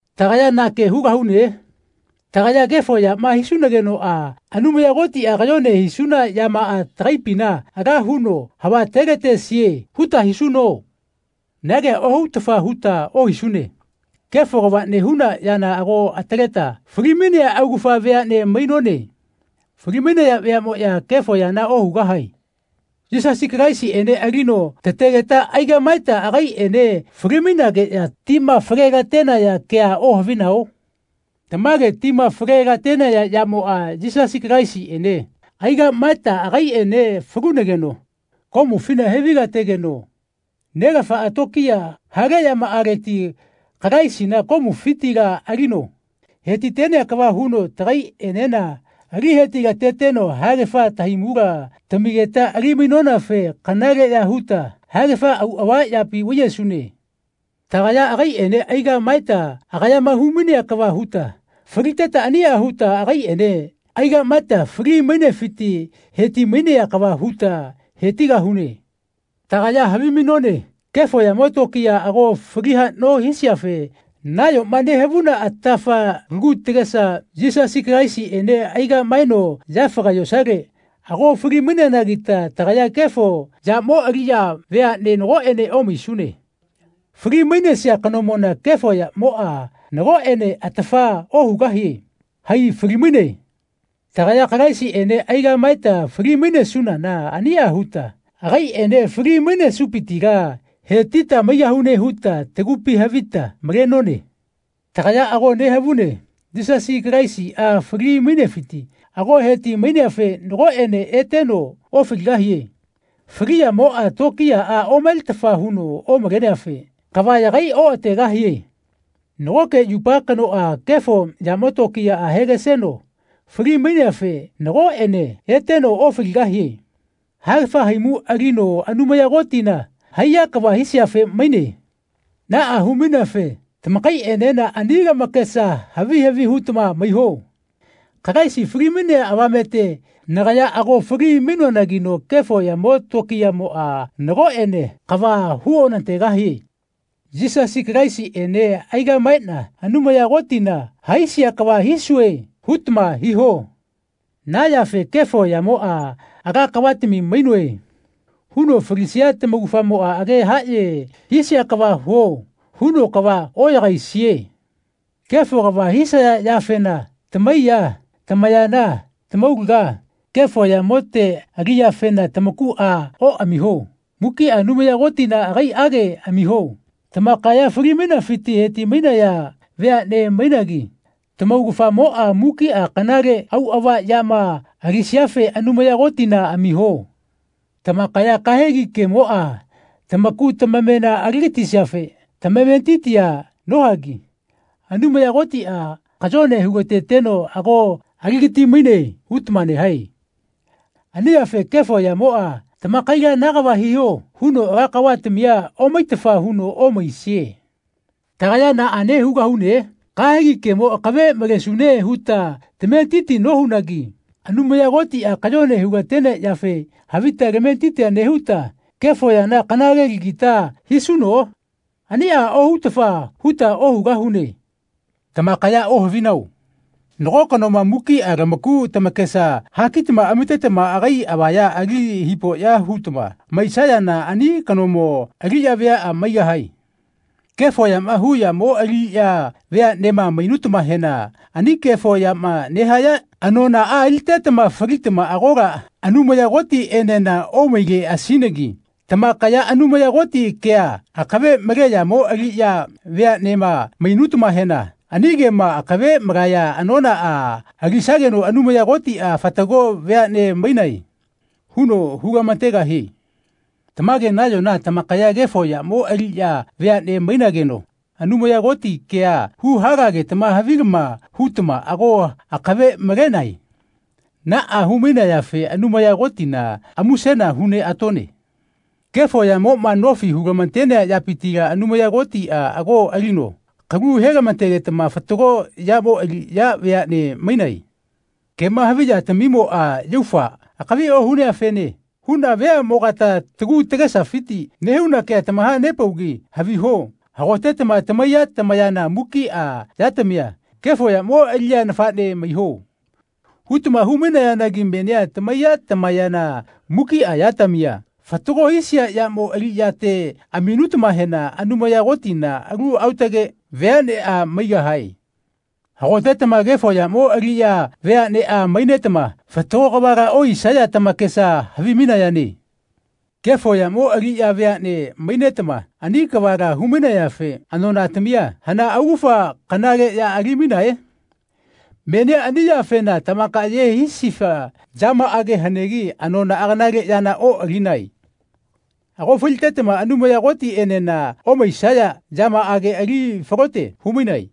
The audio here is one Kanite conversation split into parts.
Tagaya na ke hugahune? Tagaya kefo yama hisunagenoꞌa Anumaya Kotiꞌa kayone hisuna yamaꞌa tagaipina ala huno havatelatesie huta hisuno? Na kea ohutafa huta ohisune. Kefo kava nehuna yana ago ataleta falimainea augafa veaꞌne mainone. Falimainaya veaꞌmoꞌya kefo yana ohugahae. Yisasi Kalaisiꞌene alino tategeta aigaꞌmaeta agaiꞌene falimainageꞌya tima fale-latenaya kea ohavinao? Tamage tima fale-latenaya yamoꞌa Yisasi Kalaisiꞌene aigaꞌmaeta agaiꞌene falunageno komufina hevailategeno Nelafaꞌa tokiya hale yamaꞌaleti Kalaisina komufitila alino hetitenea kava huno tagaiꞌenena ali hetilateteno haegafa tahaimula tamigeta ali-mainonafe kanaleꞌya huta haegafa auꞌava yapi vaiyesune. Tagaya agaiꞌene aigaꞌmaeta agayama humainea kava huta faliteta aniꞌa huta agaiꞌene aigaꞌmaeta fali-mainefiti hetimainea kava huta hetigahune. Tagaya havimainone kefo yamo tokiya ago fali haꞌno hisiafe nayoma nehavuna atafa lagu tagesa Yisasi Kalaisiꞌene aigaꞌmaeno yafaga yosale ago fali-maineanagita tagaya kefo yamo aliꞌya veaꞌne nagoꞌene omaisune. Fali-mainesia kanomona kefo yamoꞌa nagoꞌene atafa ohugahie. Hai falimaine. Tagaya Kalaisiꞌene aigaꞌmaeta fali-mainesunana aniꞌa huta agaiꞌene fali-mainesupitila hetita maigahune huta tagupi havita malenone. Tagaya ago nehavune Yisasi Kalaisiꞌa fali-mainefiti ago heti-maineafe nagoꞌene eteno ofaligahie. Fali yamoꞌa tokiyaꞌa omaletafa huno omaleneafe kava yagai oꞌategahie. Nagoke yupa kanoꞌa kefo yamo tokiya hegaseno fali-maineafe nagoꞌene eteno ofaligahie. Haegafa haimu alino Anumaya Kotina haiya kava hisiafe maine. Naꞌa humaineafe tamakaiꞌenena ani lamakesa havi havi hutama maiho, “Kalaisi falimainea avamete nagaya ago fali-mainoanagino kefo yamo tokiyamoꞌa nagoꞌene kava huonategahie. Yisasi Kalaisiꞌene aigaꞌmaeꞌna Anumaya Kotina haisia kava hisue.” hutama hiho. Na yafe kefo yamoꞌa “Ala kavatami mainoe.” huno falisia tamaugafamoꞌa “Age haꞌye hisia kava huo.” huno kava oꞌyagaisie. Kefo kava hisaya yafena tamaiya, tamayana, tamaulaga, kefo yamote aliꞌyafena tamakuꞌa oꞌamiho. Mukiꞌa Anumaya Kotina agaiꞌage amiho. Tamakaya falimainafiti hetimainaya veaꞌne mainagi tamaugafamoꞌa mukiꞌa kanale auꞌava yama alisiafe Anumaya Kotina amiho. Tamakaya kahegi kemoꞌa tamaku tamamena aligatisiafe tamametitia nohagi “Anumaya Kotiꞌa kayone hulateteno ago aligati-maine.” hutama nehae. Ani yafe kefo yamoꞌa tamakaila “Na kava hiho.” huno ala kavatamia omaitafa huno omaisie. Tagaya naꞌane hugahune? Kahegi kemo akave malesune huta tametitia nohunagi Anumaya Kotiꞌa kayone hulatenea yafe havita tametitia nehuta kefo yana kanalelagita hisuno? Aniꞌa ohutafa huta ohugahune. Tamakaya ohavinao? Nago kanoma mukiꞌa lamaku tamakesa hakitama amitetama agai avaya ali hipoꞌya hutama maisayana ani kanomo aliꞌya veaꞌa maigahae. Kefo yama hu yamo aliꞌya veaꞌnema mainutamahena ani kefo yama nehaya anonaꞌa alitetama falitama agola Anumaya Kotiꞌenena omaileꞌasinagi tamakaya Anumaya Koti kea akave male yamo aliꞌya veaꞌnema mainutamahena ani kema akave malaya anonaꞌa alisageno Anumaya Kotiꞌa “Fatago veaꞌne mainae.” huno hulamategahie. Tamage nayona tamakaya kefo yamo aliꞌya veaꞌne mainageno Anumaya Koti kea huhalagetama havilama hutama ago akave malenae. Naꞌa humainayafe Anumaya Kotina musena huneꞌatone. Kefo yamoꞌma nofi hulamatenea yapitila Anumaya Kotiꞌa ago alino kalu helamategetama fatago yamo aliꞌya veaꞌne mainae. Kema havi yatamimoꞌa yaufa akavi ohuneafene huꞌna veaꞌmogata tagu tagesafiti nehuna kea tamahanepaugi haviho hagotetama tamaiya, tamayana, mukiꞌa yatamia “Kefo yamo aliꞌya nafaꞌne maiho.” hutama hu-mainayanagi menia tamaiya, tamayana, mukiꞌa yatamia fatago hisia yamo aliꞌyate aminutamahena Anumaya Kotina alu aotage veaꞌneꞌa maigahae. Hagotetama kefo yamo aliꞌya veaꞌneꞌa mainetama fatago kavala ohisaya tamakesa havimainayane. Kefo yamo aliꞌya veaꞌne mainetama ani kavala humainayafe anonatamia hana augafa kanale ya alimainae? Menia ani yafena tamakaye hisifa yamaꞌage hanegi anonaꞌa kanale yana oꞌalinae. Ago falitetama Anumaya Kotiꞌenena omaisaya yamaꞌage ali falote humainae.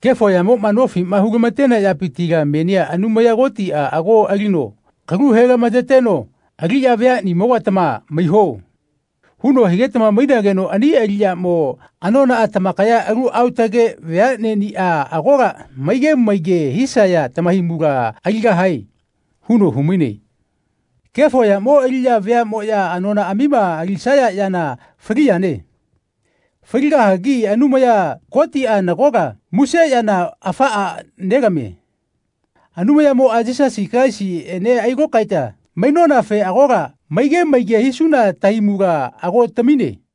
Kefo yamoꞌma nofi hulamatenea yapitila menia Anumaya Kotiꞌa ago alino kalu helamateteno “Aliꞌya veaꞌnimogatama maiho.” huno higetama mainageno ani aliꞌyamo anonaꞌa “Tamakaya alu aotage veaꞌneꞌniꞌa agola maige maige hisaya tamahaimula aligahae.” huno humaine. Kefo yamo aliꞌya veaꞌmoꞌya anonaꞌamima alisaya yana fali yane. Faligahagi Anumaya Kotiꞌa nagola muse yana afaꞌa nelamie. Anumayatimoꞌa Yisasi Kalaisiꞌene ailokaeta mainonafe agola maige maige hisuna tahaimula ago tamine.